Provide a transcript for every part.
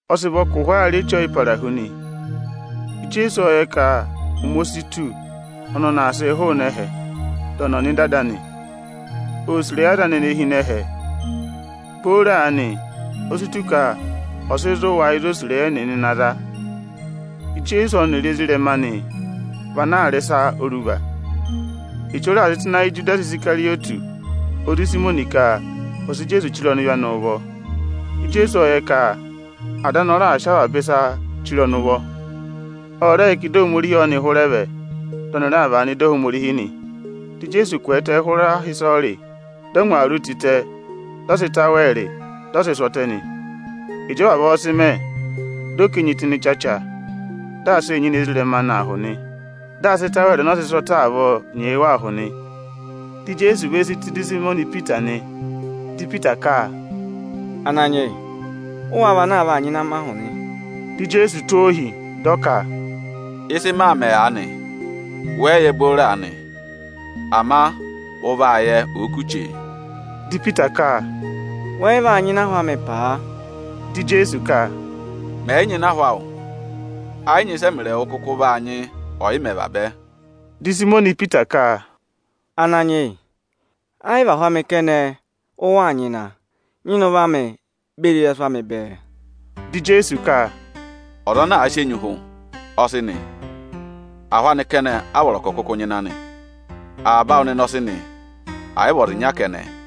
Ọ sị vọ ka ụhwọọ aa rị Eche Ọyịparahu nị. Ijeesu ộ yẹ ka ụmẹ o si tù ọnị ọnị aa sịị hụụnị ẹhẹ, dị ọnị ọ̀ nọ ịdị Ada anị. Oō sì ịrẹyị aza anị ene hi ịnị ẹhẹ. Booro aanị, o si tù ka ọ̀ sị zụ̀ wa ịzị o sì ịrẹyị ẹnịnị na za. Ijeesu ọnịrị ezirẹma anị vị ana aa rị ịsa oruva. Echu ọ raà sị tụ́ ịnị ayị Ijudasi Isikarịyọtị ozi Ịsayịmọnị ka ọ̀ sị Ijeesu chire ọnịvị anị ụvọ. Ijeesu ộ yẹ ka Ada anị ọ raà sị avaba ịsa chire ọnị ụvọ; ọ rẹ yẹ ka ịdị Ohomorihi ọ́nị hụrẹ vẹ, dị ọnị raa vàa nọ ịdị Ohomorihi nị. Dị Ijeesu kwẹẹtẹ hụrẹ aha ịsọyịrị, dị ọ ngwa awuru anị tịtẹ, dị ọ sị ịtawẹẹrị, dị ọ sị sụ́ ọtẹ nị. Ịjị ọ vavọọ sị mẹ, dị ọ ká enyi tụ́ ịnị ịchacha, dị aa sịị nyịna ezirẹma anị ahụ nị. Dị aa sị ịtawẹẹrị ọnọọ sị sụ́ ọtẹ avọọ nyee wa ahụ nị. Dị Ijeesu ve si tù ịdị Ịsayịmọnị Ipita nị. Dị Ipita ka: “Ananyị yị ụ wáá vị ana aa vaa nyịna mị ahụ nị?” Dị Ijeesu tụ́ ọ ohi, dị ọ ka, “Ịsị maa mẹ̀ aanị, wẹ yị yẹ booro aanị, ama ụ vaa yẹ, òo kù chee.” Dị Ipita ka, “Wẹ yị vaa nyịna ahụ amị paa!” Dị Ijeesu ka, “Mẹ̀ yị nyịna ahụ awụ, ẹ yị nyị ịsị ẹmịrị ẹwụ kụkụ vaa nyị ọyịmẹ̀ vabẹ.” Dị Ịsayịmọnị Ipita ka, “Ananyị yị, ẹ yị vị ahụ amị kẹnẹ ụ waa nyịna, nyịna ụvọ amị beri ịrẹsụ amị bẹẹ!” Dị Ijeesu ka, “Ọza ana àa sị enyi hụ, ọ sị nị; ahụ anị kẹnẹ a vọrọ ka ọ̀ kụkụ nyịna nị. Avaba awụ nịnị ọ sị nị, ẹ̀ yị vị ọza ịnya kẹnẹ.”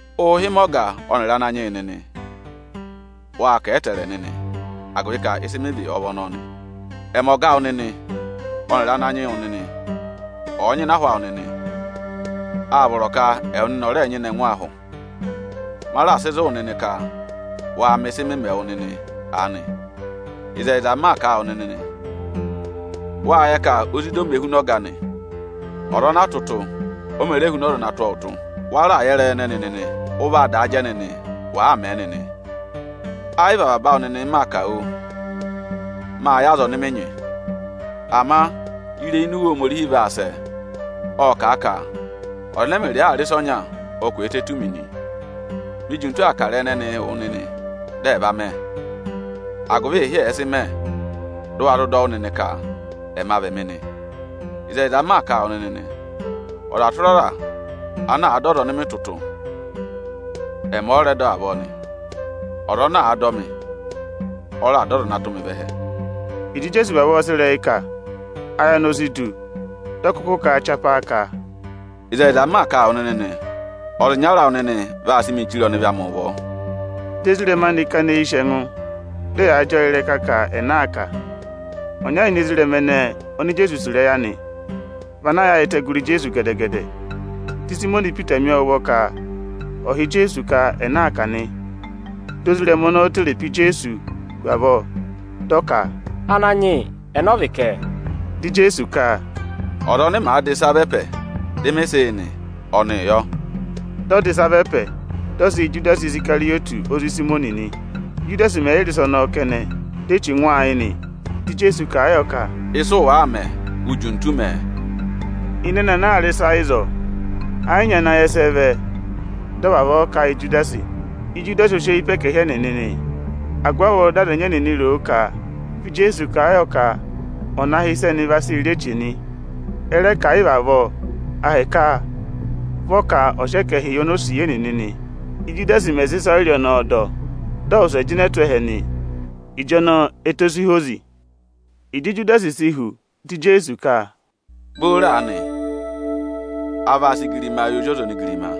Ụụ̄ hị́ mị ọga ọnịrị Ananyị yị nịnị; wâ kà a ẹtẹẹrẹ nịnị, agụvị ka ịsị mị vị ọ vị ọnọọ nị. Ẹmị, ọga awụ nịnị ọnịrị Ananyị-wụ nịnị, ọ̀ọ nyịna ahụ awụ nịnị, â vọrọ ka ẹwụ nịnị ọ̀ rẹẹ nyịna ẹngụ ahụ. Ma raà sị zụ̀ wụ nịnị ka waa mẹ ịsị mị mẹ wụ nịnị aanị. Ịzẹyịza m maa kà a wụ nịnị nị, wâ yẹ ka ozida o mē huna ọga anị. Ọza ana a tụ́ ụtụ, o mē re huna ọza ana tụ́ ọọ ụtụ. Wa raà yẹ ịrẹyị ẹnẹnị nịnị. Ụ vaa daa jẹ nịnị, wàaa mẹ̀ ẹ nịnị. Ẹ yị vị avaba awụ nịnị m maa kà, oo! Mâ yẹ aza ọnị mị nyị. Ama ịrẹyị ini Iwe Ohomorihi vaa sẹ, ộ kà a ka: ‘Ọza ẹnẹ ẹmịrịị aa rị ịsa ọnya, ọ kwẹẹtẹ tù mi nị.’ Mi jintu aa kà ịrẹyị ẹnẹnịị wụ nịnị dị ẹ̀ va mẹ, agụvị ịhị ẹ̀ẹ sị mẹ, dị ụ wa zụ dọ wụ́ nịnị ka ‘Ẹma vị Ẹmị’ nị. Ịzẹyịza m maa kà a wụ nịnị nị, ọza tụra ọza ana àa dọ ọza ọnị mị tụ́ ụtụ, ẹmị ọ rẹ dọ avọọ nị. Ọza ana àa dọ mị, ọ rẹ dọ Ọza ana tụ́ mị vẹ ẹhẹ.” Ịjị Ijeesu vavọọ sị ịrẹyị kà, ayị anị o si du. Dị ọ kụkụ kà a chapaa ka, “Ịzẹyịza m maa kà a wụ nịnị nị, ọza ịnyara awụ nịnị vaa sị mịị chire ọnịvị amị ụvọ.” Dị ezirẹma anị kana eyi sì ẹngụ, dị ẹyaa jị ọọ ịrẹka ka ẹnẹ aa kà nị. Ọnya ini ezirẹma ẹnẹẹ oni Ijeesu sì ịrẹyị anị vị ana yaayịtẹ gụrị Ijeesu gẹdẹ-gẹdẹ. Dị Ịsayịmọnị Ipita mi ọọ ụvọ ka ọ̀ họ̀ Ijeesu ka ẹnẹ aa kà nị. Di ozirẹma ọnọọ tere pe Ijeesu hu avọọ, dị ọ ka, “Ananyị yị ẹnẹ ọ vị kẹ?” Dị Ijeesu ka, “Ọza ọnị màa dà ịsa vá ẹpẹ, dị mị sị yị nị, ọnịị yọ.” Dị ọ dà ịsa vá ẹpẹ, dị ọ sị yị Ijudasi Isikarịyọtị ozi Ịsayịmọnị nị. Íjudasi mẹ̀ yị rị ịsa ọnọọ kẹnẹ, di Echu ngụ ọọ ayị nị. Dị Ijeesu kà a yọ ka, “Ịsị ụ wàaa mẹ, u jintu mẹ̀ ẹ!” Ịnị ẹnị ana aa rị ịsa ịzọọ, ẹ yị nyị ana yẹ ịsị ẹ vẹ dị ọ vavọọ kà yị Ijudasi. Ijudasi o sị eyi pe ẹkẹhị ẹnịnị nị, agụvị avọọ dị aza ẹnyị ẹnịnị ro ka vị Ijeesu kà a yọ ka ọ̀ na hị́ ịsị ẹnị vaa sị rị eche nị. Ẹ rẹ ka ẹ̀ yị vị avọọ, ahịka vị ọ ka ọ̀ sị ẹkẹhị yị onosiye nịnị nị. Íjudasi mẹ̀ sị ịsọyịrị ọnọọ dọ, dị ọ wụsẹ jịnẹ tụ́ ẹhẹ nị. Ịjọnọọ ẹtẹ o si hozi. Ịjị Ijudasi si hu, dị Ijeesu ka, “Booro aanị, aa vaa sị igirimaa yị Ozi ọza onigirima,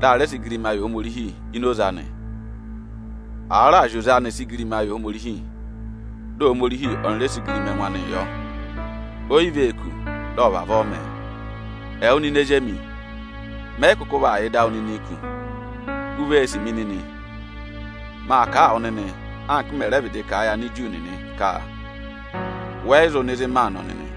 dị a rẹ sị igirima yị Ohomorihi ini oze anị. Àa raà zị oze anị sị igirima yị Ohomorihi, di Ohomorihi ọnị rẹ sị igirima ẹngụ anịị yọ. O yi vee kù dị ọ̀ vavọọ mẹ̀ ẹ. Ẹwụ nịnị ezi emi, mẹ yị kụkụ vaa yà ịdị awụ nịnịị kù. U vee sì mi nịnị. Maa kà a wụ nịnị anka m mẹ̀ rẹ vịdị kà a yị Aniju nịnị ka, wẹ yị zụ nọ ịzị maa nọ nịnị.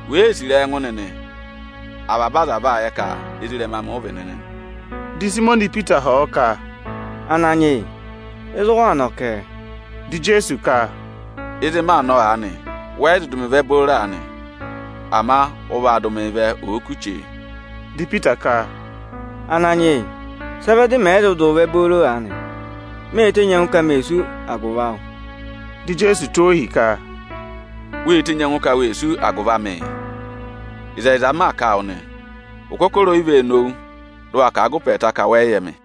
Wèe sì ịrẹyị ẹngụ nịnị, avaba aza vaa yẹ ka ezirẹma amị ụ vị nịnị nị.” Di Ịsayịmọnị Ipita họ̀ ọ ka, “Ananyị yị, ịzị ụ waa nọ kẹ?” Dị Ijeesu ka, “Ịzị maa nọ aanị, wẹ yị zụ dụ mị vẹ booro aanị; ama ụ vaa dụ mịị vẹ, òo kù chee.” Dị Ipita ka, “Ananyị yị, sị ẹ vẹ dị mẹ̀ yị zụ dụ wụ vẹ booro aanị? Mê tenyi ẹngụ ka me sú agụvị awụ.” Dị Ijeesu tụ́ ọ ohi ka, “Wê tenyi ẹngụ ka we sú agụvị amịị? Ịzẹyịza m maa kà a wụ nị, ụkọkọrọ o yi vee nowu, dị ụ wa kà a gụ ụpẹ ẹẹta ka wẹ yị yẹ mị.”